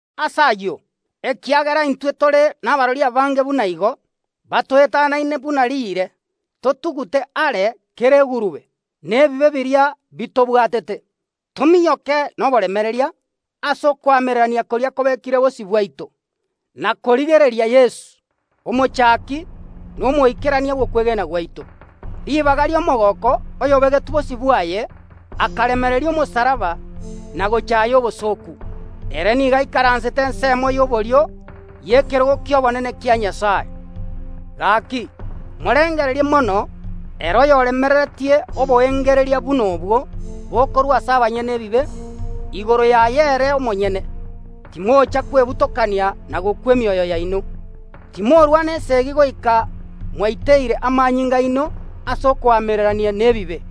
Ase ayio, ekiagera intwe tore nabarori abange buna igo, batoetanaine buna riire, totugute are kera egurube, na ebibe biria bitobwatete. Tominyoke noboremereria ase okoamererania koria kobekire bosio bwaito, na korigereria Yeso, omochaki na omoikerania bw’okwegena gwaito. Ribaga ri’omogooko oyobegetwe bosio bwaye, akaremereria omosalaba na gochaaya obosooku, ere nigo aikaransete ensemo ya borio y’ekerogo ki’obonene kia Nyasae. Gaki, morengererie mono ere oyoremereretie oboengereria buna obwo bokorwa ase abanyene ebibe igoro yaye ere omonyene, timocha kwebutokania na gokwa emioyo yaino. Timorarwana esegi goika mwaiteire amanyinga aino ase okoamererania nebibe,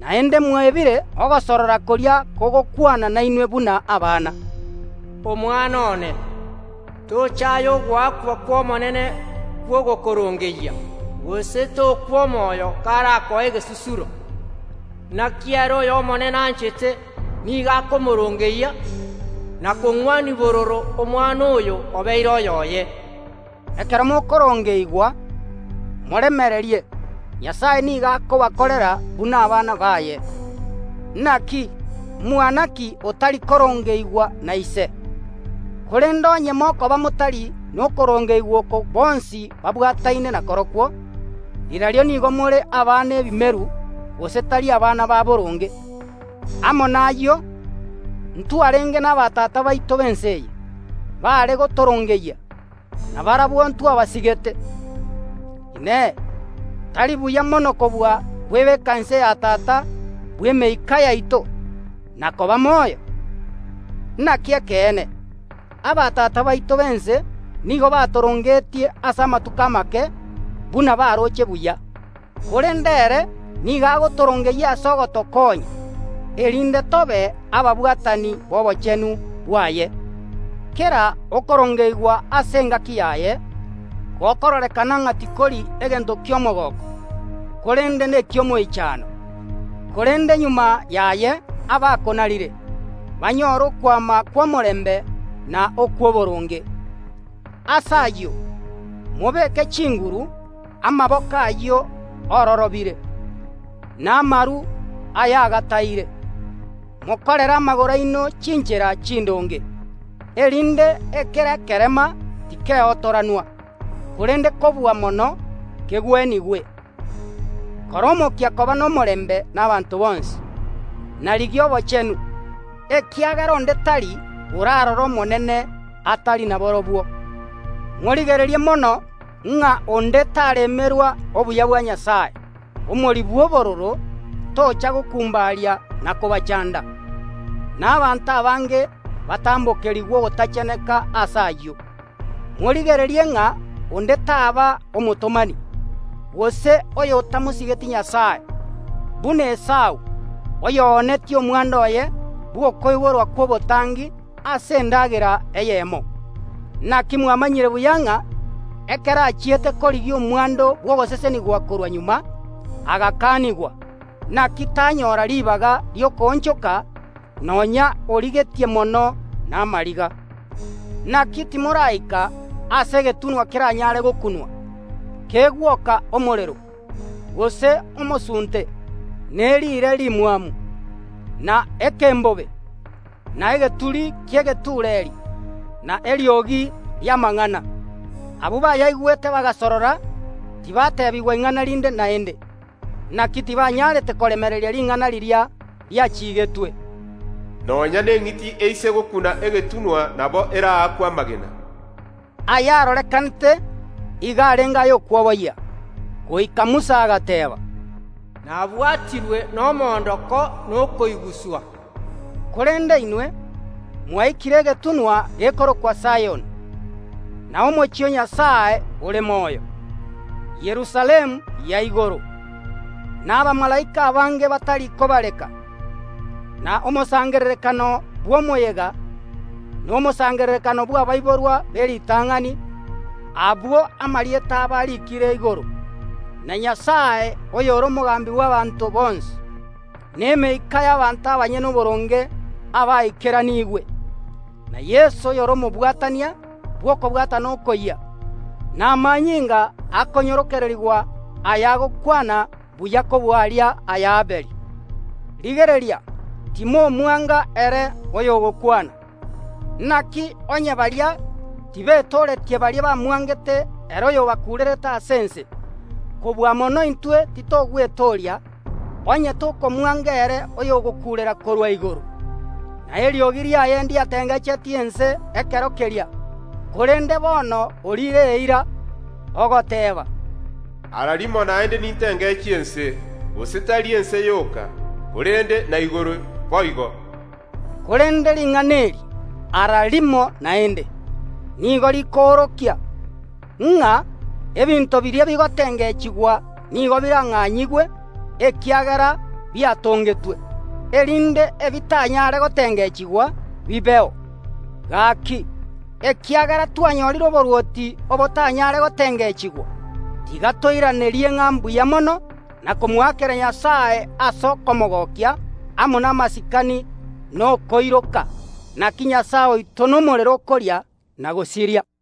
naende mwebire ogosorora koria kogokwana nainwe buna abana, “Omwana one, tochaya ogoakwa kw’Omonene kw’ogokorongeyia, gose tokwa omoyo karakoe egesusuro. Naki ere oyo Omonene anchete nigo akomoorongeyia, na kong’wania bororo omwana oyo obeire oyoye.” Ekero mokorongeigwa moremererie Nyasae nigo akobakorera buna abana baye. Naki, mwana ki otari korongeigwa na ise? Korende onye mokoba motari nokorongeigwa oko bonsi babwataine nakorokwo, rirorio nigo more abana ebimeru gose tari abana ba boronge. Amo nayio ntwarenge nabatata baito b’ense eye, baare gotorongeyia, na barabwo ntwabasigete. Inee! Tari buya mono kobua kwebeka inse ya Tata bw’emeika yaito, na koba moyo? Naki ekeene, abatata baito b’ense nigo batorongeetie ase amatuko amake buna baroche buya, korende ere nigo agotorongeyia ase ogotokonya, erinde tobe ababwatani b’obochenu bwaye. Kera okorongeigwa ase engaki yaye gokororekana ng’a tikori egento ki’omogooko, korende neki’omoichano. Korende magega yaye abakonarire banyore okwama kw’omorembe na okw’oboronge. Ase ayio, mobeke chinguru amaboko ayio ororobire, na amaru ayagataire. Mokorere amagoro aino chinchera chindonge, erinde ekere ekerema tikeotoranwa, korende kobua mono kegwenigwe. Kora omokia koba nomorembe nabaanto bonsi, na rigia obochenu, ekiagera onde tari orarore Omonene, atari naborobwo. Morigererie mono ng’a onde taremerwa obuya bwa Nyasae, “omori bw’obororo” tocha gokumbaria na kobachanda, na abanto abange batambokerigwe ogotacheneka ase oyio. Morigererie ng’a onde taba omotomani, gose oyotamosigeti Nyasae, buna Esau, oyoonetie omwando oye bw’okoiborwa kw’obotangi ase endagera eyemo. Naki mwamanyire buya ng’a ekero achiete korigia omwando bw’ogosesenigwa korwa magega, agakanigwa, naki tanyora ribaga ri’okoonchoka nonya oririgetie mono namariga. Naki timoraika ase egetunwa keranyare gokunwa, kegwoka omorero, gose omosunte, ne riire rimwamu, na ekembobe, na egeturi ki’egetureeri, na eriogi ri’amang’ana. Abwo bayaigwete bagasorora tibateebigwa ing’ana rinde naende. Naki tibanyarete koremereria ring’ana riria riachiigetwe, “Nonya neng’iti eise gokuna egetunwa nabo eraakwe amagena.” Aya arorekanete igo arenge ay’okwoboyia, goika Musa agateeba, “Nabwatirwe nomoondoko na okoiguswa.” Korende inwe mwaikire egetunwa gekorokwa Sayoni, na omochie o Nyasae ore moyo, Yerusalemu ya igoro, na abamalaika abange batari kobareka, na omosangererekano bw’omoyega, na omosangererekano bw’abaiborwa b’eritang’ani, abwo amarieta abo ariikire igoro, na Nyasae oyore omogambi bw’abaanto bonsi, na emeika y’abanto abanyene oboronge abaikeraniigwe, na Yeso oyore omobwatania bw’okobwatana okoyia, na amanyinga akonyororokerigwa ayagokwana buya kobua aria ay’Abeli. Rigereria, timomwanga ere oyogokwana. Naki onye baria tibetooretie baria bamwangete ere oyobakuurerete ase ense, kobua mono intwe titogwetooria onye tokomwanga ere oyogotokuurera korwa igoro. Na eriogi riaye ndiatengechetie ense ekero keria, korende bono oriire eira, ogoteeba, “Ara rimo naende nintengechie ense, gose tari ense yoka, korende na igoro boigo.” Korende ring’ana eri, “Ara rimo naende”, nigo rikoorokia, ng’a ebinto biria bigotengechigwa nigo birang’anyigwe ekiagera biatongetwe, erinde ebitanyare gotengechigwa bibeo. Gaki, ekiagera twanyorire oborwoti obotanyare gotengechigwa, tiga toiranerie ng’a mbuya mono na komokorera Nyasae ase okomogokia amo namasikani na okoiroka. Naki Nyasae oito nomorero okoria na gosiria.